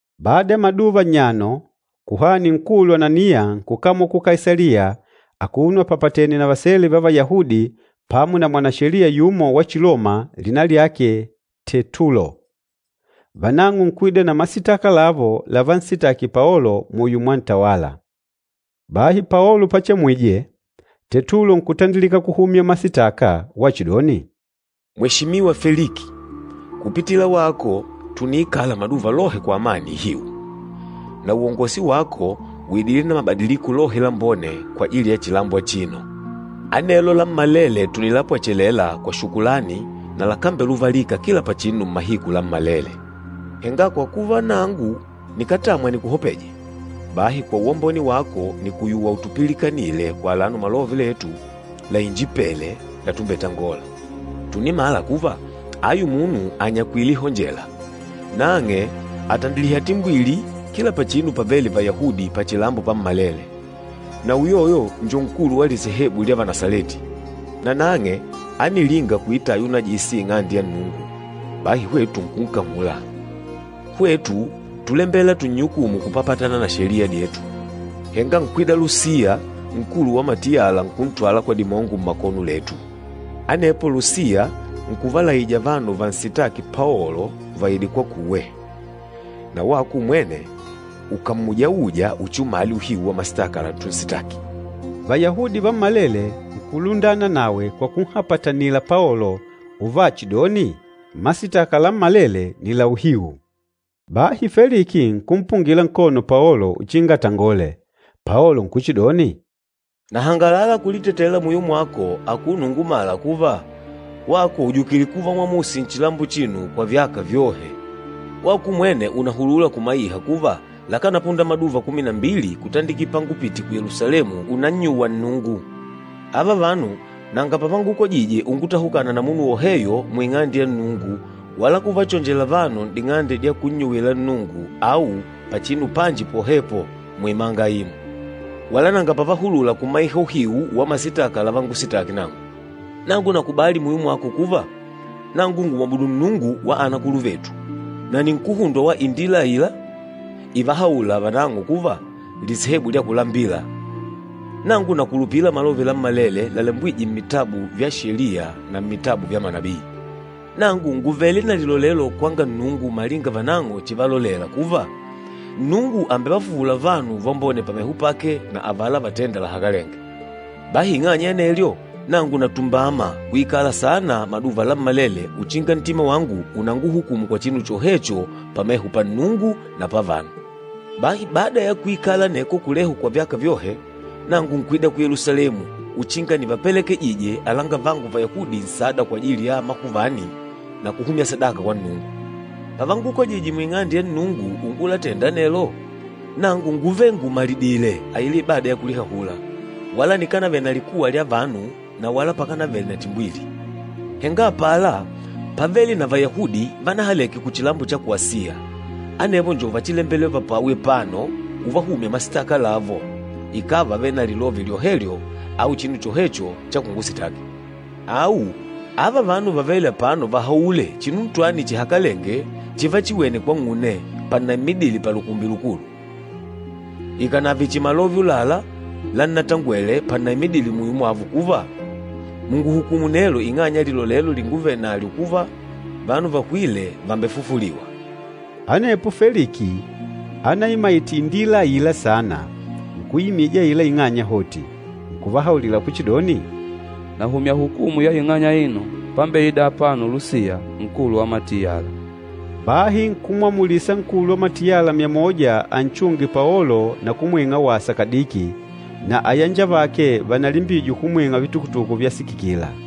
Bada ya maduva nnyano, Kuhani Nkulu Ananiya nkukamola ku Kaisaliya akuno apapatènè na vasele va Vayahudi pamo na mwanasheliya yumo wa Chiloma lina lyake Tetulo. Vanang'o nkwida na masitaka lavo lavansitaki Paolo muyo mwa ntawala. Bahi Paolo pachemwije, Tetulo nkutandilika kuhumya masitaka wachidoni, “Mweshimiwa Feliki, kupitila wako tùniikala maduva lohe kwa amani ihiu. Na uongosi wako ùidile na mabadiliko lohe lambone kwajili ya chilambo achino. Anelo lammalele tùnilapwechelela kwa shukulani na lakambeluvalika kila pachinu mmahiku lammalele. Henga kwa kuva nangu nikátamwa nikuhopeje, bahi kwa uwambone wako nìkuyuwa utupilikanile kwa alano malove letu lainjipele latumbetangola. Tùnimala kuva ayu munu ànyakwile ihonjela. Nang'e àtandiliha timbwili kila pachinu pavêle Vayahudi pachilambo pammalele. Na uyoyo njo nkulu wa lisehebu lya Vanasaleti. Na nang'e ánilinga kuitaya unajisi Ing'ande ya Nnungu, bahi hwetu nkunkamula. [Hwetu túlembela tunnyukumu kupapatana na sheliya dyetu. Henga nkwida Lusiya, nkulu wa matiyala nkuntwala kwa dimongo mmakono letu. Anepo Lusiya nkuvalaija vanu vansitâki Paolo vaide kwakuwe.] Na wako umwene ukammujauja uchiumale uhiu wa masitaka latunsitaki.” Vayahudi vammalele nkulundana nawe kwa kunhapatanila Paolo uvachidoni, masitaka lammalele nni la uhiu. Bahi Feliki nkumpungila nkono Paolo uchinga atangole. Paolo nkuchidoni, “Nahangalala kulitetela muyo mwako akuno ungumàlà kuva wako ùjukile kuva mwamusi nchilambo achino kwa vyaka vyohe. Wako umwene ùnahulula kumaiha kuva lakanapunda maduva kumi na mbili kutandikila pangupite ku Yelusalemu unannyuwa Nnungu. Ava vanu nanga pavangukojije ungutahukana na munu woheyo mu Ing'ande ya Nnungu wala kuvachonjela vanu n'ding'ande dya kunnyuwila Nnungu au pachinu panji pohepo muimanga aino. Wala nanga pavahulula kumaiha uhiu wa masitaka lavangusitaki nangu. Nangu nakubali muyo mwako kuva, nangu ngùmwabudu Nnungu wa anakuluvetu, na nni nkuhundwa wa Indila aila, ivahaûla vanang'o kuva lisehebu lya kulambila. Nangu nakulupila malove lammalele lalembwîje mmitabu vya Sheliya na mmitabu vya manabii. Nangu ngùvele na lilolelo kwanga Nnungu malinga vanang'o chivalolela kuva, Nnungu àmbevafufula vanu vambone pameho pake na avala vatênda lahakalenge. Bahi ing'anya ya anelyo nangu natumbama kuikala saana maduva lammalele uchinga ntima wangu unanguhukumu kwa chinu chohecho pameho pa Nnungu na pavanu. Bahi bada ya kuikala aneko kulehu kwa vyaka vyohe, nangu nkuida ku Yelusalemu uchinga nivapelekejije alangavangu Vayahudi nsada kwajili ya amahuvani na kuhumya sadaka kwa Nnungu. Pavangukojije mu Ing'ande ya Nnungu ungulatenda anelo, nangu ngúvele ngumalidìlè aila ibada ya kulihahula. Wala nikanavele na likuwa lya vanu na wala pakanavele na timbwili. Henga apala pávele na Vayahudi vanahaleke kuchilambo cha ku Asiya, anevo njo vachilembelewa vapwawe apano uvahumya masitaka lavo ikàva vavêle na lilove lyohelyo au chinu chohecho chakungusitaki. Au, ava vanu vavêle apano vahaule chinu ntwani chihakalenge chivachiwene kwang'une pannaimidile pa Lukumbi Lukulu, ikànave chihi malove ulala lannatangwele pannaimidile muyo mwavo kuva, ‘Mùnguhukumu nelo ing'anya ya lilolelo linguvenalyo kuva, vanu vahwîle vàmbefufuliwa!’” Anepo Feliki, anaimaite Indila aila saana, nkuiimija aila ing'anya hoti. Nkuvahaulila kuchidoni, “Nahumya hukumu ya ing'anya aino pambeida apano Lusiya nkulu wa matiyala.” Bahi nkumwamulisa nkulu wa matiyala myamoja anchunge Paolo na kumwing'a wasa kadiki, na ayanjavake vanalimbijwe kumwing'a vitukutuku vyasikikila.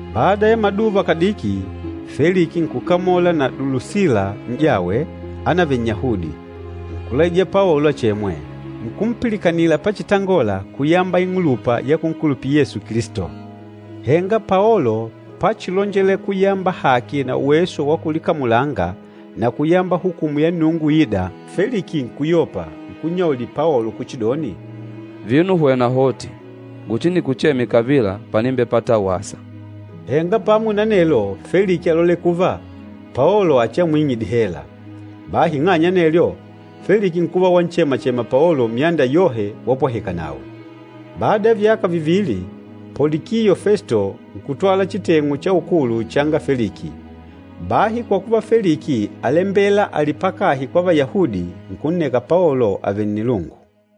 Bada ya maduva kadiki, Feliki nkukamola na Dulusila n'jawe, anavele Nnyahudi. Nkulaija Paolo achemwe, nkumpilikanila pachitangola kuyamba ing'ulupa ya kunkulupila Yesu Kilisto. Henga Paolo pachilonjelela kuyamba haki na uweso wa kulikamulanga na kuyamba hukumu ya Nnungu iîda, Feliki nkuyopa, nkunnyauli Paolo kuchidoni, “Vino hwena hoti, nguchinikucheme kavila panimbepata wasa.” Henga pamo na anelo Feliki álolela kuva, Paolo achiamwing'e dihela. Bahi ing'anya ya anelyo, Feliki nkuva wanchemachema Paolo myanda yohe wapwahika nawe. Bada ya vyaka vivili, Polikiyo Festo nkutwala chiteng'u cha ukulu changa Feliki. Bahi kwa kuva Feliki álembela alipakahe kwa Vayahudi, nkunneka Paolo avèlè nnilungu.